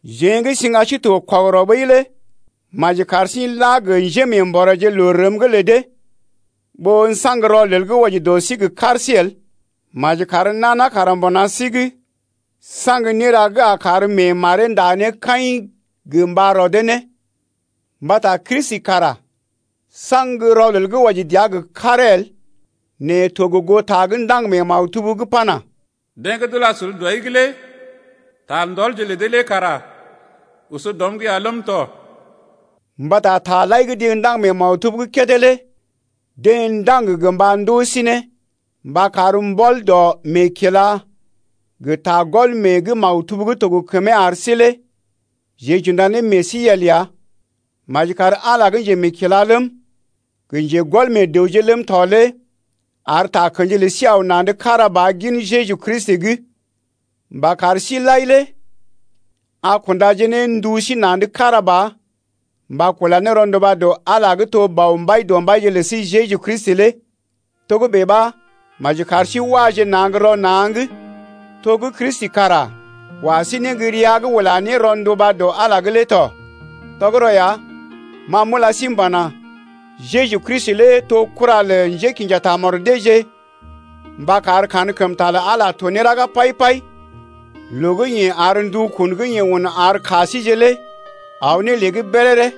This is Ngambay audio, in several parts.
Jeḛ gə́ siŋga sí to kɔgərɔ ɓəi lé maji kar sí n’laje gə njémeembɔréje loo rəm’g lə dee ɓó n’saŋgje rɔlel gə́ wɔji dɔ sí gə kar sí el. Maji kar nana kara mbuna sí’g saŋg néra gə́ a kar mee maree nda ne kaḭ gə mba rodee ne. Mbata Kristi kara saŋg rɔlel gə́ wɔji dəa gə karee el nɛ to gə goo ta gə́ ndaŋg mee maktub’g pana: Deḛ gə́ d’ula sul dɔi’g lé ta ndɔlje lə dee lé kara oso dɔm’g ya ləm tɔ. Mbata taje lai gə́ deḛ ndaŋg mee maktub’g kédé lé deḛ ndaŋg gə mba ndoo sí ne mba kar mbɔl dɔ meekila gə ta gɔl mee gə́ maktub gə́ to gə kəmee ar sí lé jeḛ j’unda ne meḛ sí yel ya. Maji kar Ala gə́ njemeekila ləm, gə njégɔl meḛ dəwje ləm tɔ lé ar takə̰ji lə sí aw na̰’d kára ba gin Jeju Kristi’g mba kar sí lai lé a kundaje ne ndu sí na̰’d kára ba mba kula ne rɔnduba dɔ Ala lé gə́ to Bɔ Mbaidɔmbaije lə sí Jeju Kristi lé. Togə́bè ɓa maji kar sí waje na̰ gə́ rɔ na̰’g to gə́ Kristi kara wa sí ne gə́ rəa’g ula ne rɔnduba dɔ Ala’g lé tɔ. Tɔgərɔ ya, ma m’ula sí m’pana: Jeju Kristi lé to kura lə njékḭja tamɔd deeje mba kar kankəmta lə Ala to ne raga pai-pai loo gə́ yeḛ ar ndukun gə́ yeḛ un ar ka síje lé aw ne lée’g béréré.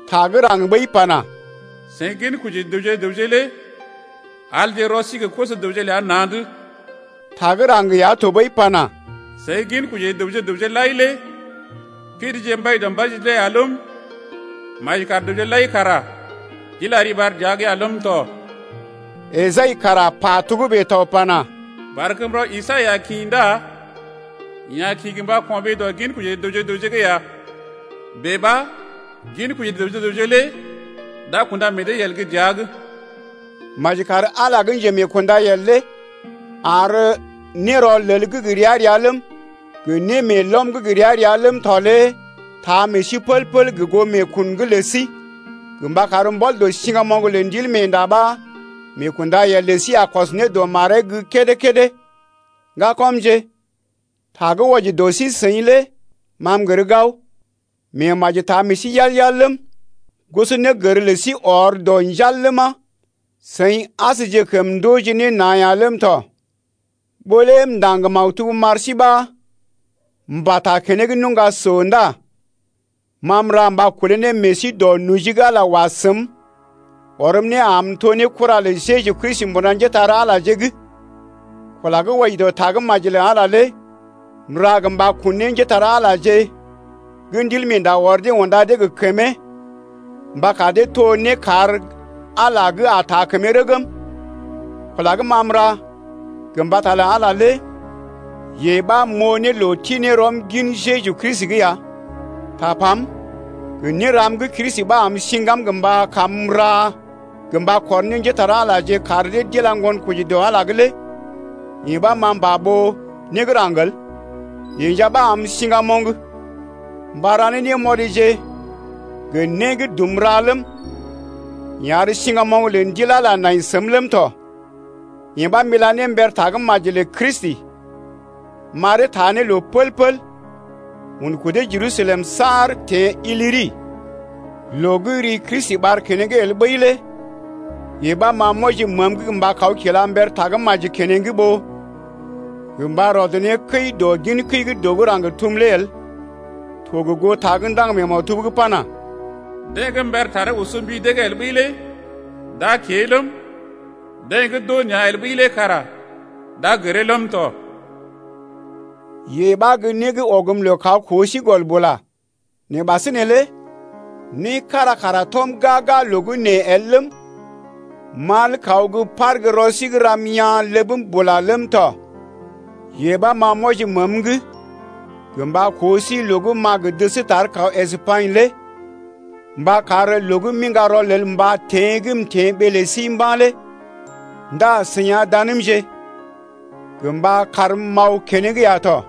Ta gə́ raŋg ɓəi pana: Seḭ ginkoji dəwje gə raŋg lé alje rɔ sí gə koso-dəwje ləa na̰’d. Ta gə́ raŋg ya tɔɓəi pana: Seḭ ginkoji dəwje gə raŋg lai lé pidije Mbaidɔmbaije lé ya ləm, Maji kar dəwje lai kara d’ila riɓar dəa’g ya ləm tɔ. Esai kara pa togə́bè tɔ pana: Barkəmrɔ Isai a kḭ Ndá yeḛ a kḭ mba ko̰ɓee dɔ ginkoji dəwje gə raŋg ya. Bèe ɓa ginkoji dəwje gə raŋg lé d’a kunda meḛ dee yel gə́ dəa’g. Maji kar Ala gə́ njemeekṵdayel lé ar nérɔlel’g gə ria-ria ləm, gə némeelɔm’g gə ria-ria ləm tɔ lé taa meḛ sí pəl-pəl gə goo meekun’g lə sí, gə mba kar mbɔl dɔ siŋgamoŋ lə Ndilmeenda ɓa meekundayel lə sí a kɔs ne dɔ maree’g gə́ kédé-kédé. Ŋgakɔmje, ta gə́ wɔji dɔ sí-seḭ lé ma m’gər gao, meemaji taa meḛ sí yal-yal ləm, gosonégər lə sí ɔr dɔ njal ləma, seḭ asjekəm ndooje ne na̰ ya ləm tɔ. Ɓó lé m’ndaŋg maktub m’ar sí ɓa m’pata keneŋ nuŋga so ndá ma m’ra mba kolé ne meḛ sí dɔ noji gə́ Ala wa səm ɔrm ne am m’to ne kura lə Jeju Kristi mbuna njépole-magəje’g. Kula gə́ wɔji dɔ Tagə́maji lə Ala lé m’ra gə mba kun ne njépole-magəje gə́ Ndilmeenda ɔr dee unda dee gə kəmee mba kar dee to nékar Ala gə́ a taa kəmee rəgm. Kula gə́ ma m’ra gə mbata lə Ala lé yee ɓa m’oo ne loo ti ne rɔm gin Jeju Kristi’g ya. Tapam gə néram gə́ Kristi ɓa am siŋgam mba kam m’ra gə mba kɔr ne njépole-magəje kar dee d’ila ŋgonkoji dɔ Ala’g lé yee ɓa ma m’pa ɓó né gə́ raŋg el. Yeḛ nja ɓa am siŋgamoŋ mba ra ne némɔrije gə né gə́ dum ra ləm, yeḛ ar siŋgamoŋ lə Ndil Ala nai səm ləm tɔ. Yee ɓa m’ila ne mber tagə́maji lə Kristi m’aree taa ne loo pəl-pəl un kudee Jerusalem saar teḛ Ilyri. Loo gə́ ri Kristi ɓar keneŋ el ɓəi lé yee ɓa ma m’wɔji məəm’g mba kaw kila mber tagə́maji keneŋ ɓó gə mba rɔd ne kəi dɔ gin kəi gə́ dəw gə́ raŋg tum lé el, to gə goo ta gə́ ndaŋg mee maktub’g pana: Deḛ gə́ mbər taree oso mbi dee’g el ɓəi lé d’a kée ləm, Deḛ gə́ d’oo nea̰ el ɓəi lé kara d’a gəree ləm tɔ. Yee ɓa gə́ né gə́ ɔgm loo kaw koo sí gɔl bula. Nɛ ɓasinè lé né kára kara tɔm gaa-gaa loo gə́ nee el ləm, mal kaw gə́ par gə́ rɔ sí’g ram yaa̰ ləbm bula ləm tɔ. Yee ɓa ma m’wɔji məəm’g gə mba koo sí loo gə́ m’a gə dəs tar kaw Espagnə lé mba kar loo gə́ m’iŋga rɔlel mbata teḛ gə́ m’teḛ ɓee lə sí mba̰ lé ndá seḭ a danmje gə mba karm m’aw keneŋ ya tɔ.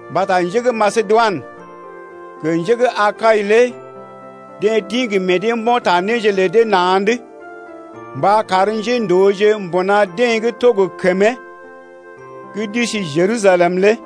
Mbata njé gə́ Masedoinə gə njé gə́ Akai lé deḛ d’ḭ gə meḛ dee mbo̰ ta néje lə dee na̰’d mba kar njéndooje mbuna deḛ gə́ to gə kəmee gə́ d’isi Jerusalem lé.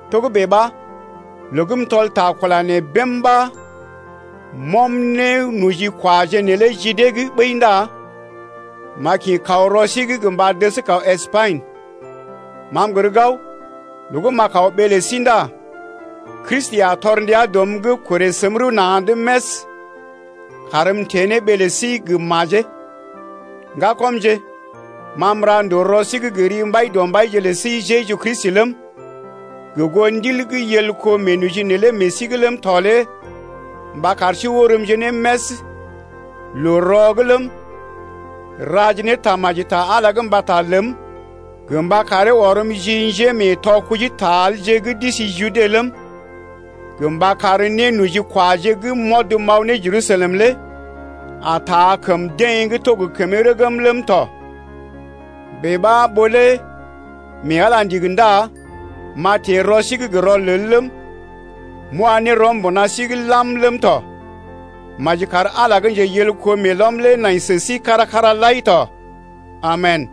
Togə́bè ɓa, loo gə́ m’tɔl ta kula nee bém ɓa m’ɔm nénojikwaje neelé ji dee’g ɓəi ndá m’a kḭ kaw rɔ sí’g mba dəs kaw Espagnə. Ma m’gər gao loo gə́ m’a kaw ɓee lə sí ndá Kristi a tɔr ndia dɔm’g korè səm rəw na̰’d més karm m’teḛ ne ɓee lə sí gə́ majee. Ŋgakɔmje, ma m’ra ndòo rɔ sí’g gə ri Mbaidɔmbaije lə sí Jeju Kristi ləm, gə goo Ndil gə́ yel kó meenoji neelé meḛ sí’g ləm tɔ lé mba kar sí orəmje ne més loo-rɔ’g ləm, raje ne tamaji ta Ala’g mbata ləm gə mba karee ɔrm ji njémeetɔ kujitaelje’g gə́ d’isi Jude ləm, gə mba kar nénojikwaje gə́ m’ɔd m’aw ne Jerusalem lé a taa kəm deḛ gə́ to gə kəmee rəgm ləm tɔ. Bèe ɓa ɓó lé mee Ala ndigi ndá m’a teḛ rɔ sí’g gə rɔlel ləm, m’wa ne rɔm mbuna sí’g lam ləm tɔ. Maji kar Ala gə́ njeyelko meelɔm lé nai sə sí kára-kára lai tɔ. Amen!